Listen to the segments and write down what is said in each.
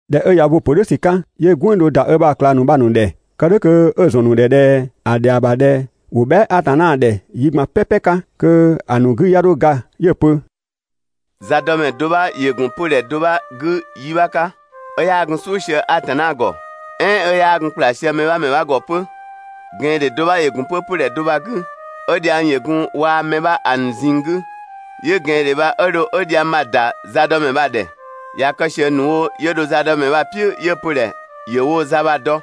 ꞊Dhɛ 'ö ꞊ya ö bo‑ ‑pö "dhʋ̈ ‑sü 'ka, 'yö "gwënng do ‑da ö ‑bha ꞊klang ‑nu bha‑ ‑nu ‑dhɛ, kë "dhʋ̈ kö 'ö‑ ‑zɔn ‑nu ‑dhɛ ꞊dhɛ ‑a ‑dhɛa ‑bha ꞊dhɛ ‑wo bhɛa" Atanna ‑dhɛ yi ꞊gban "pɛpɛ 'ka kö‑ ‑nu 'gü 'ya 'dho ga 'yö‑ pö: «Zadɔmɛ do 'bha ‑yö ‑gun 'pödhɛ do 'bha 'gü yi 'bha 'ka, 'ö 'yaa gun "suʋ̈ sië Atanna ‑gɔ, "ɛɛn 'ö 'yaa gun ‑kpla sië mɛ 'bha ‑mɛ ‑bha ‑mɛ 'bha ‑gɔ 'pö. ꞊Gɛandhe do 'bha ‑yö ‑gun 'pö 'pödhɛ do bha‑ 'gü, 'ö dhiang ‑yö gun waa‑ mɛ 'bha ‑a ‑nu ꞊zinng 'gü. 'Yö ꞊gɛandhe bha 'ö dho 'ö dhiang bha‑ ‑da zadɔmɛ bha‑ ‑dhɛ. ꞊Ya kë ꞊sië ‑nu wo 'yö dho zadɔmɛ bha‑ "piʋ̈, 'yö‑ pö‑ ‑dhɛ ‑yö woo‑ za bha‑ dɔ.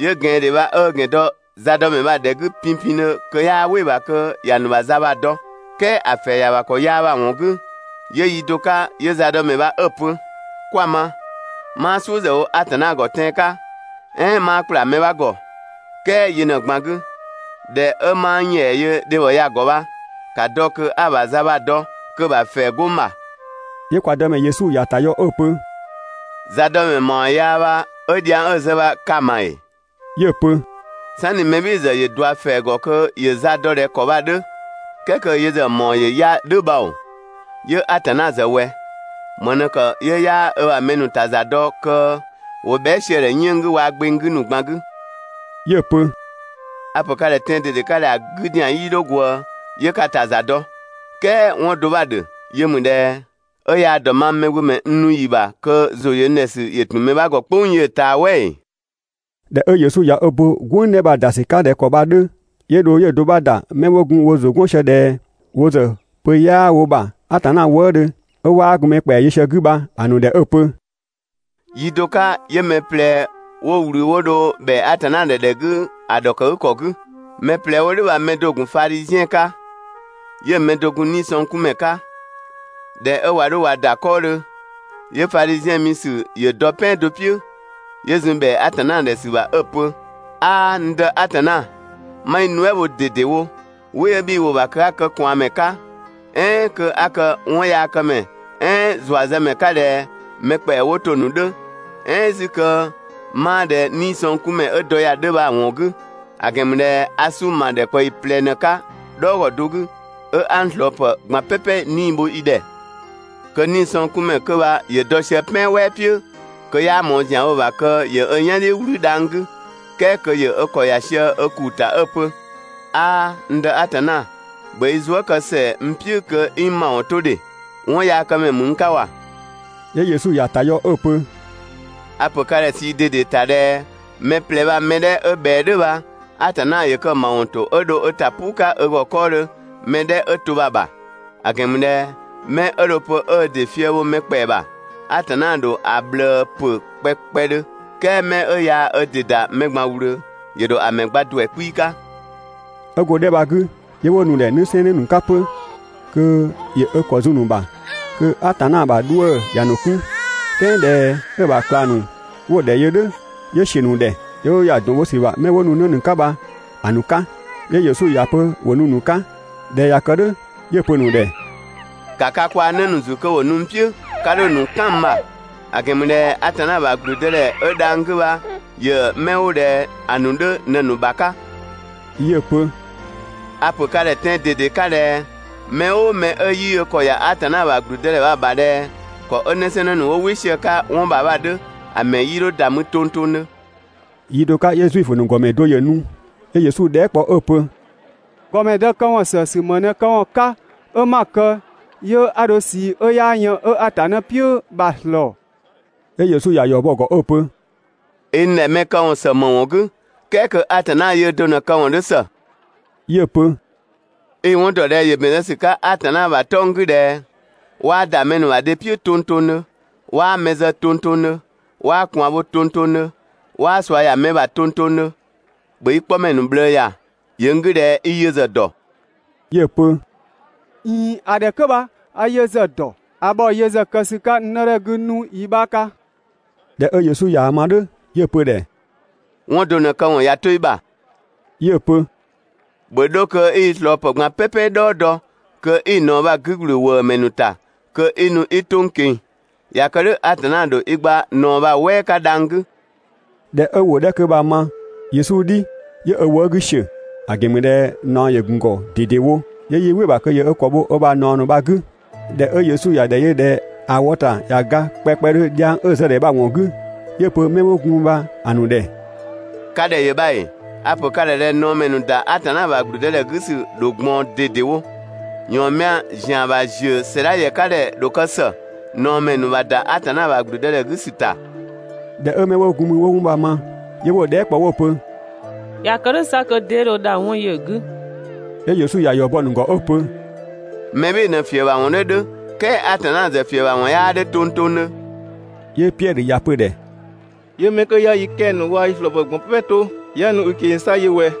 'Yö ꞊gɛandhe bha 'ö ö ‑gɛn dɔ zadɔmɛ bha‑ ‑dhɛ 'gü pinpindhö kö 'yaa "wɩ‑ ‑bha kö ‑ya ‑nu ‑bha za bha‑ dɔ. "Kɛɛ ‑a ‑fɛɛ ‑ya ‑bha ‑kɔ yaa bha‑ ‑wɔn 'gü, 'yö yi do 'ka 'yö zadɔmɛ bha 'ö‑ pö: «'Kwa‑ ma, 'maa "suʋ̈ ‑zë wo Atanna ‑gɔ tɛan‑ 'ka, "ɛɛn 'maa ‑kpla mɛ 'bha ‑gɔ, "kɛɛ yö ꞊në‑ ꞊gban 'gü, ꞊dhɛ 'ö 'maa n ‑yɛa yö dhebhɔ ya‑ ‑gɔ bha, ‑ka dɔ kö 'a‑ ‑bha za bha‑ dɔ kö‑ ‑bha ‑fɛɛ 'go n ‑bha.» 'Yö kwa Dëmɛ Yesu ‑ya ‑ta yɔ 'ö‑ pö: «Zadɔmɛ ‑mawɔn yaa bha 'ö dhiang 'ö‑ zë bha ka‑ ma ‑ee?» 'Yö‑ pö: «("Sanni mɛ "bhɩɩ‑ ‑zë ‑yö ꞊dua ‑fɛɛ ‑gɔ kö ‑yö za dɔ ꞊dhɛ ‑kɔ bha‑ 'dhö, "kɛɛ kö yö ‑zë ‑mawɔn ‑yö 'ya‑ "dhʋ̈ bha ‑oo,) 'yö Atanna ‑zë ꞊wɛ? ‑Më ꞊në ‑kë 'yö 'yaa ö ‑bha mɛ ‑nu ‑ta ‑za dɔ kö ‑wo bhɛa" sië‑ ‑dhɛ 'yënng‑ 'gü waa‑ gbeng 'gü ‑nu ꞊gban 'gü?» 'Yö‑ pö: «A‑ ‑pö ka ‑dhɛ tɛan‑ ꞊dede 'ka ꞊dhɛ: ‑A 'gü ‑zian 'yii 'dho ꞊gwëë 'yö ka ‑ta ‑za dɔ. "Kɛɛ 'wɔn do 'bha‑ ‑dhö, yö ‑mü ꞊dhɛ: 'Ö yaa‑ ‑dɔ mang Mɛgbömɛ n nu ‑yi ‑bha kö ‑zʋ ‑yö n ‑dhɛ ‑sü ‑yö ‑tun mɛ 'bha ‑gɔ "kpʋng yö ꞊taa "wɛ ‑ee?» ꞊Dhɛ 'ö Yesu ꞊ya ö bo "gwënng 'dhɛ bha‑ ‑da ‑sü 'ka ꞊dhɛ ‑kɔ bha‑ 'dhö, 'yö dho 'yö‑ do 'bha ‑da 'mɛ 'wo gun wo ‑zʋ 'gɔn sië ꞊dhɛ wo ‑zë pö 'yaa wo ‑bha Atanna wëëdhö, 'ö 'waa gun mɛ ‑kpɛa yö sië‑ 'gü bha‑ ‑nu ‑dhɛ 'ö‑ pö: «Yi do 'ka, 'yö mɛ ꞊plɛ 'wo ꞊wlü 'wo dho ‑bhɛa Atanna ‑dhɛ ‑dhɛ 'gü ‑a ‑dhɔkëgükɔ 'gü. Mɛ ꞊plɛ 'wo "dhʋ̈ bha‑ mɛ do ‑gun Fadhiziɛn 'ka. 'Yö‑ mɛ do‑ gun 'niisɔngkunmɛ 'ka. ꞊Dhɛ 'ö ꞊wa 'dho ꞊wa ‑da 'kɔɔdhö, 'yö‑ Fadhiziɛn mi ‑sü ‑yö dɔ "pɛan do "piʋ̈, 'yö zun ‑bhɛa Atanna ‑dhɛ ‑sü ‑bha 'ö‑ pö: «'Aa, n Dë Atanna, 'ma i nuɛ" bho ꞊dedewo, "wɩ 'ö bhii‑ wo‑ ‑bha kö 'a kë ꞊kwaanmɛ 'ka, "ɛɛn kö 'a kë 'wɔnyaakëmɛ "ɛɛn ‑zuazëmɛ 'ka ꞊dhɛ mɛ ‑kpɛa 'wo to‑ ‑nu 'dhö, "ɛɛn 'zü kö 'maa ꞊dhɛ 'niisɔngkunmɛ 'ö dɔ ya‑ 'dhö bha‑ ‑wɔn 'gü; ‑a ‑gɛn ‑mü ꞊dhɛ a 'sunng‑ ‑ma ‑dhɛkpaɔyi ꞊plɛ ꞊në 'ka "dhɔɔgɔ do 'gü, 'ö 'a n ꞊slɔɔpë ꞊gban "pɛpɛ 'nii‑ bho i ‑dhɛ.» Kö 'niisɔngkunmɛ 'kö bha ‑yö dɔ sië "pɛan "wɛɛ "piʋ̈, kö 'yaa ꞊mɔɔ ‑zian wo‑ ‑bha kö ‑yö ö "yan "dhiʋ̈ "wlü dhang‑ 'gü. "kɛɛ kö ‑yö ö ‑kɔ ‑ya sië ö ‑kuu 'gü 'ö‑ pö: «'Aaa, n Dë Atanna, ‑bhö i zuë" kë ‑sɛa n "piʋ̈ kö 'i n ‑mawɔn 'to ‑dhe, 'wɔnyaakëmɛ ‑mü n 'ka ‑wa.» 'Yö Yesu ‑ya ‑ta yɔ 'ö‑ pö: «A‑ ‑pö ka ‑dhɛ ꞊sii ꞊dede ‑ta ꞊dhɛ mɛ ꞊plɛ bha‑ mɛ 'dhɛ 'ö ꞊bhɛa "dhʋ̈ bha, Atanna ‑yö kë‑ ‑mawɔn ‑to 'ö dho ö ‑ta "puu 'ka ö ‑gɔ 'kɔɔdhö mɛ 'dhɛ 'ö to bha‑ ‑bha; ‑a ‑gɛn ‑mü ꞊dhɛ 'mɛ 'ö dho‑ pö 'ö ö ‑dɩ fië bho mɛ ‑kpɛa ‑bha, Atanna ‑dho ‑a ꞊bhlëë ‑pö kpɛkpɛdhö, "kɛɛ 'mɛ 'ö yaa ö ‑dɩ ‑da mɛ ꞊gban ꞊wlöö, ‑yö ‑dho ‑a ‑mɛ gba ‑duɛ 'kpii‑ 'ka.» 'Ö go‑ 'dhɛ bha‑ 'gü, 'yö 'wo nu‑ ‑dhɛ 'në 'sɛɛnnë ‑nu 'ka 'pö kö ‑yö ö ‑kɔ zun‑ ‑nu ‑bha kö Atanna ‑bha 'dhuë‑ ‑ya ‑nu 'kun. "Kɛɛ ꞊dhɛ 'ö‑ ‑bha ꞊klang ‑nu 'wo‑ ‑dhɛ yö "dhʋ̈, 'yö ‑siö ‑nu ‑dhɛ, 'yö 'wo ‑ya ‑dɔn bho ‑sü ‑bha 'mɛ 'wo nu 'në ‑nu 'ka bha‑ ‑nu 'ka. 'Yö Yesu ‑ya pö ‑wo nu‑ ‑nu 'ka. ꞊Dhɛ ꞊ya kë "dhʋ̈ 'yö‑ pö‑ ‑nu ‑dhɛ: «‑Ka ka kwaa‑ 'në ‑nu ‑zü kö ‑wo nu n "piʋ̈, 'ka 'dho‑ ‑nu "kan n ‑bha, ‑a ‑gɛn ‑mü ꞊dhɛ Atanna ‑bha ‑gblüdëdhɛ 'ö dhang‑ 'gü bha ‑yö 'mɛ 'wo ꞊dhɛ ‑a ‑nu 'dhö ꞊në‑ ‑nu ‑bha 'ka.» 'Yö‑ pö: «A‑ ‑pö ka ‑dhɛ tɛan‑ ꞊dede 'ka ꞊dhɛ: Mɛ "ʋʋ mɛ 'ö 'yii ö ‑kɔ ‑ya Atanna ‑bha ‑gblüdëdhɛ bha‑ ‑bha ꞊dhɛ ‑kɔ 'ö 'nësɛɛnnë ‑nu 'wo "wɩ sië‑ 'ka 'wɔn ‑bha bha‑ 'dhö, ‑a ‑mɛ 'yii 'dho ‑da mü tongtongdhö.» Yi do 'ka 'yö Zuifö ‑nu ‑gɔmɛ do ‑yö nu, 'yö Yesu dhɛɛ" kpɔ 'ö‑ pö: «‑Gɔmɛdë këwɔn ‑sësü, ‑më ꞊në këwɔn 'ka 'ö 'ma‑ kë 'yö a dho ꞊sii 'ö 'yaa yën 'ö Atanna "piʋ̈ bha‑ ‑slɔɔ?» 'Yö Yesu ‑ya ‑yɔ bɔ‑ ‑gɔ 'ö‑ pö: «I n ‑dhɛ mɛ këwɔn ‑së ‑më ‑wɔn 'gü, "kɛɛ kö Atanna yöö do ꞊në‑ këwɔn 'dhö ‑së?» 'Yö‑ pö: «I‑ 'wɔn ‑dɔ ꞊dhɛ ‑yö ‑bɛn zë ‑sü 'ka Atanna ‑bha 'tɔng‑ 'gü ꞊dhɛ: ‹'Waa ‑da mɛ ‑nu ‑bha dhe "piʋ̈ tongtongdhö, 'waa mɛ zë tongtongdhö, 'waa ꞊kwaan bho tongtongdhö, 'waa ꞊sua ‑ya mɛ 'bha ‑bha tongtongdhö, ‑bhö i 'kpɔmɛ ‑nu ꞊bhlëë ‑ya.› ‑Yö n 'gü ꞊dhɛ i yö ‑zë ‑dɔ.» 'Yö‑ pö: «꞊Iin, ‑a 'dhɛ 'kö bha a yö ‑zë ‑dɔ, a ‑bhɔ yö ‑zë kë ‑sü 'ka n 'nëdhɛ 'gü 'nu yi 'bha 'ka.» ꞊Dhɛ 'ö Yesu ꞊yaa‑ ma "dhʋ̈ 'yö‑ pö‑ ‑dhɛ: «'Wɔn do ꞊në‑ këwɔn ꞊ya 'to i ‑bha.» 'Yö‑ pö: «‑Bhö 'dho kö 'i i ꞊slɔɔpë ꞊gban "pɛpɛ "dhɔɔ dɔ kö i‑ ꞊naɔ bha 'gü ‑gblü ‑wëëmɛ ‑nu ‑ta kö 'i nu 'i 'to n ꞊keng‑, ꞊ya kë "dhʋ̈ Atanna ‑dho i gba ꞊naɔ bha‑ "wɛɛ 'ka dhang‑ 'gü.» ꞊Dhɛ 'ö ‑wʋ 'dhɛ 'kö bha‑ ma Yesu "dhi, 'yö ö wëë' 'gü ‑siö, ‑a ‑gɛn ‑mü ꞊dhɛ ꞊naɔ ‑yö ‑gun ‑gɔ ꞊dedewo, 'yö 'yii "wɩ‑ ‑bha kö ‑yö ö ‑kɔ bho ö ‑bha ꞊naɔ bha‑ 'gü. ꞊Dhɛ 'ö Yesu ‑ya ‑dhɛ yö ꞊dhɛ ‑a wɔ ‑ta ꞊ya ga kpɛkpɛdhö dhiang 'ö‑ zë‑ ‑dhɛ bha‑ ‑wɔn 'gü, 'yö‑ pö 'mɛ 'wo gun mü bha‑ ‑nu ‑dhɛ: «Ka ‑dhɛ ‑yö bha ‑ee? A‑ ‑pö ka ‑dhɛ ꞊dhɛ ꞊naɔmɛ ‑nu ‑da Atanna ‑bha ‑gblüdëdhɛ 'gü ‑sü ‑dho ꞊gbaɔn ꞊dedewo. ‑Yɔɔnmɛa ‑zian ‑bha ‑ziö ‑sɛdha ‑yɛ 'ka ‑dhɛ ‑dho kë ‑së ꞊naɔmɛ ‑nu ‑bha ‑da Atanna ‑bha ‑gblüdëdhɛ 'gü ‑sü ‑ta.» ꞊Dhɛ 'ö 'mɛ 'wo gun mü 'wo 'wɔn bha‑ ma, 'yö 'wo‑ dhɛɛ" kpɔ 'wo‑ pö: «꞊Ya kë "dhʋ̈ 'sa kö 'dee dho dha 'wɔn yö‑ 'gü?» 'Yö Yesu ‑ya ‑yɔ bɔ‑ ‑nu ‑gɔ 'ö‑ pö: «Mɛ "bhɩɩ‑ ꞊në‑ ‑fiëbhawɔn 'dhö 'dhö, "kɛɛ Atanna ‑zë ‑fiëbhawɔn 'yaa 'dhö tongtongdhö.» 'Yö Piɛdhö ‑ya pö‑ ‑dhɛ: 'Yö 'mɛ 'kö 'ya yi 'kɛ‑ ‑nu waa‑ yi ꞊slɔɔpë ꞊gban "pɛpɛ 'to 'ya nu i ꞊keng‑ 'sa yö ꞊wɛ?»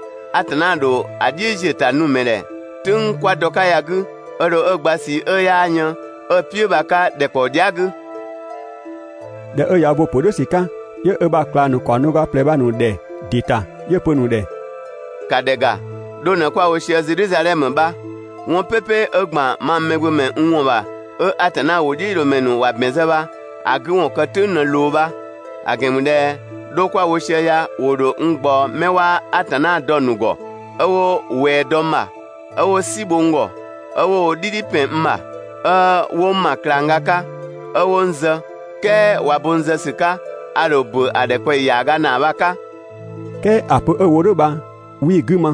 Atanna ‑dho ‑a "dhiʋ̈ziöta nu‑ ‑mɛ ‑dhɛ "tʋ̈ng 'kwa dɔ‑ 'ka ya‑ 'gü, 'ö dho 'ö‑ gba ꞊sii 'ö 'yaa yën 'ö‑ "piʋ̈ bha‑ 'ka ‑dhɛkpaɔ dhia" 'gü.» ꞊Dhɛ 'ö ꞊ya ö bo‑ ‑pö "dhʋ̈ ‑sü 'ka, 'yö ö ‑bha ꞊klang ‑nu ‑kaɔng do ga ꞊plɛ bha‑ ‑nu ‑dhɛ ‑dɩ ‑ta, 'yö‑ pö‑ ‑nu ‑dhɛ: «‑Ka ‑dhɛ ‑ga, 'dho ꞊në kwa‑ wo sië Zedhizadhɛmö bha. 'Wɔn "pɛpɛ 'ö ‑gban mang Mɛgbömɛ n ‑wɔn ‑bha 'ö Atanna ‑wʋdhiʋ̈loomɛ ‑nu ‑wa ‑bɛn zë bha, ‑a 'gü ‑wɔn kë "tʋ̈ng ꞊në ꞊loo bha, ‑a ‑gɛn ‑mü ꞊dhɛ 'dho kwa‑ wo sië ya ‑wo ‑dho n ꞊gbaɔ 'mɛ 'waa Atanna dɔ‑ ‑nu ‑gɔ, 'ö 'wo ꞊wɛɛ dɔ n ‑bha, 'ö 'wo "si bho n ‑gɔ, 'ö 'wo wo "dhidhi ‑pɛn n ‑bha, 'ö 'wo n ‑ma ꞊klangga 'ka, 'ö 'wo n zë, "kɛɛ ꞊wa bo n zë ‑sü 'ka, a ‑dho ‑bö ‑a ‑dhɛkpaɔyi ‑yaaga ‑naa bha‑ 'ka.» "Kɛɛ ‑a pö 'ö‑ wo "dhʋ̈ bha 'wii‑ 'gü ma,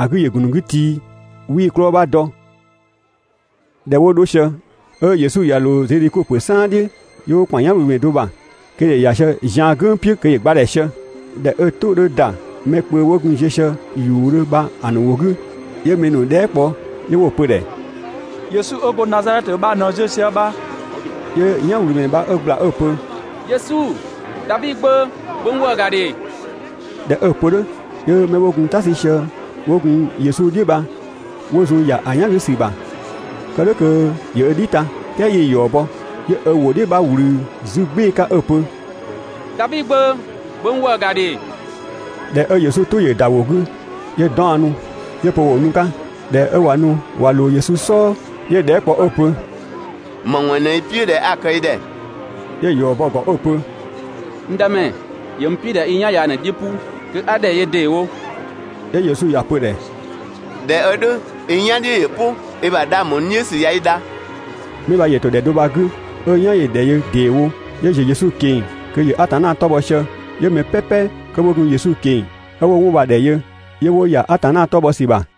‑a 'gü ‑yö ‑gun ‑nu 'gü tii', 'wii‑ 'klɔɔ‑ 'bha dɔ. ꞊Dhɛ 'wo 'dho sië, 'ö Yesu ꞊ya ꞊loo Zedhiko ‑pö "saan "dhiʋ̈, 'yö 'wo ‑kpan "yanwlümɛ do ‑bha kö ‑yö ‑ya sië zian "gʋ̈ng "piʋ̈ kö ‑yö gba ‑dhɛ sië. ꞊Dhɛ 'ö‑ "tʋ 'dhö ‑da mɛ kpö 'wo gun ziö sië ‑yuudhö bha‑ ‑nu ‑wʋ 'gü, 'yö mɛ ‑nu dhɛɛ" kpɔ, 'yö 'wo‑ pö‑ ‑dhɛ: «Yesu 'ö go Nazadhɛtö bha ꞊në ziö sië bha.» 'Yö "yanwlümɛ bha 'ö ꞊gbla 'ö‑ pö: «Yesu, Davi Gbö, ‑bhö n ‑wëë ‑ga ‑dhe!» ꞊Dhɛ 'ö‑ pö "dhʋ̈, 'yö 'mɛ 'wo gun "ta 'sü sië 'wo gun Yesu "dhiʋ̈ bha 'wo zun ‑ya ‑a "yan 'gü ‑sü ‑bha, kë "dhʋ̈ kö ‑yö ö "dhi ta. "Kɛɛ 'yii‑ ‑yɔ bɔ, 'yö ö ‑wʋ "dhiʋ̈ 'bha ꞊wlü 'zü "gbɩɩ‑ 'ka 'ö‑ pö: «Davi Gbö, ‑bhö n ‑wëë ‑ga ‑dhe!» ꞊Dhɛ 'ö Yesu "tʋ ‑yö ‑da ‑a ‑wʋ 'gü, 'yö 'daɔnnu, 'yö‑ pö ‑wo nu‑ 'ka ö ‑dhɛ. ꞊Dhɛ 'ö ꞊wa nu ꞊wa ꞊loo‑ 'ka Yesu "sɔɔ, 'yö‑ dhɛɛ" kpɔ 'ö‑ pö: «‑Më ‑wɔn ꞊në 'i‑ "piʋ̈ ꞊dhɛ 'a‑ kë i ‑dhɛ?» 'Yö‑ ‑yɔ bɔ‑ ‑gɔ 'ö‑ pö: «N Dëmɛ, ‑yö n "piʋ̈ ꞊dhɛ 'i n "yan ya ꞊në‑ "dhiʋ̈ "pʋ kö a ‑dhɛ yö ‑deewo.» 'Yö Yesu ‑ya pö‑ ‑dhɛ: «꞊Dhɛ 'ö "dhʋ̈, i "yan "dhiʋ̈ ‑yö "pʋ, i ‑bha 'dhang ‑bho n "dhiʋ̈ ‑sü ꞊ya i dha!» 'Mɛ bha ‑yö ‑to ‑dhɛ do bha‑ 'gü 'ö‑ "yan ‑yö ‑dhɛ yö ‑deewo, 'yö ‑ziö Yesu ꞊keng‑ kö ‑yö Atanna 'tɔ bhɔ sië. 'Yö mɛ "pɛpɛ 'kö 'wo gun Yesu ꞊keng‑, 'ö 'wo 'wɔn bha‑ ‑dhɛ yö, 'yö 'wo ‑ya Atanna 'tɔ bhɔ ‑sü ‑bha.